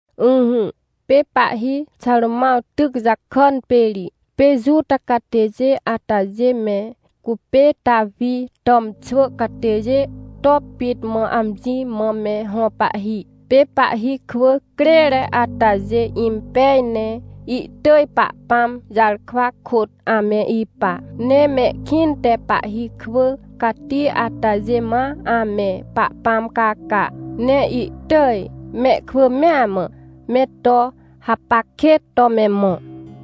Ỹhỹ, pê pahhi Xarômãw tyc jakàn pê ri, pê Juta catêjê atajê me cupê Tawi tàmxwỳ catêjê to pit mã amjimã me hõ pahhi. Pê pahhi kwỳ crêre atajê impej ne ihtỳj Pahpãm jarkwa kôt ame ipa. Ne mehkĩnte pahhi kwỳ cati atajê ma ame Pahpãmcaca, ne ihtỳj, mehkwỳ mea mã, me to hapac kêt to me mõ.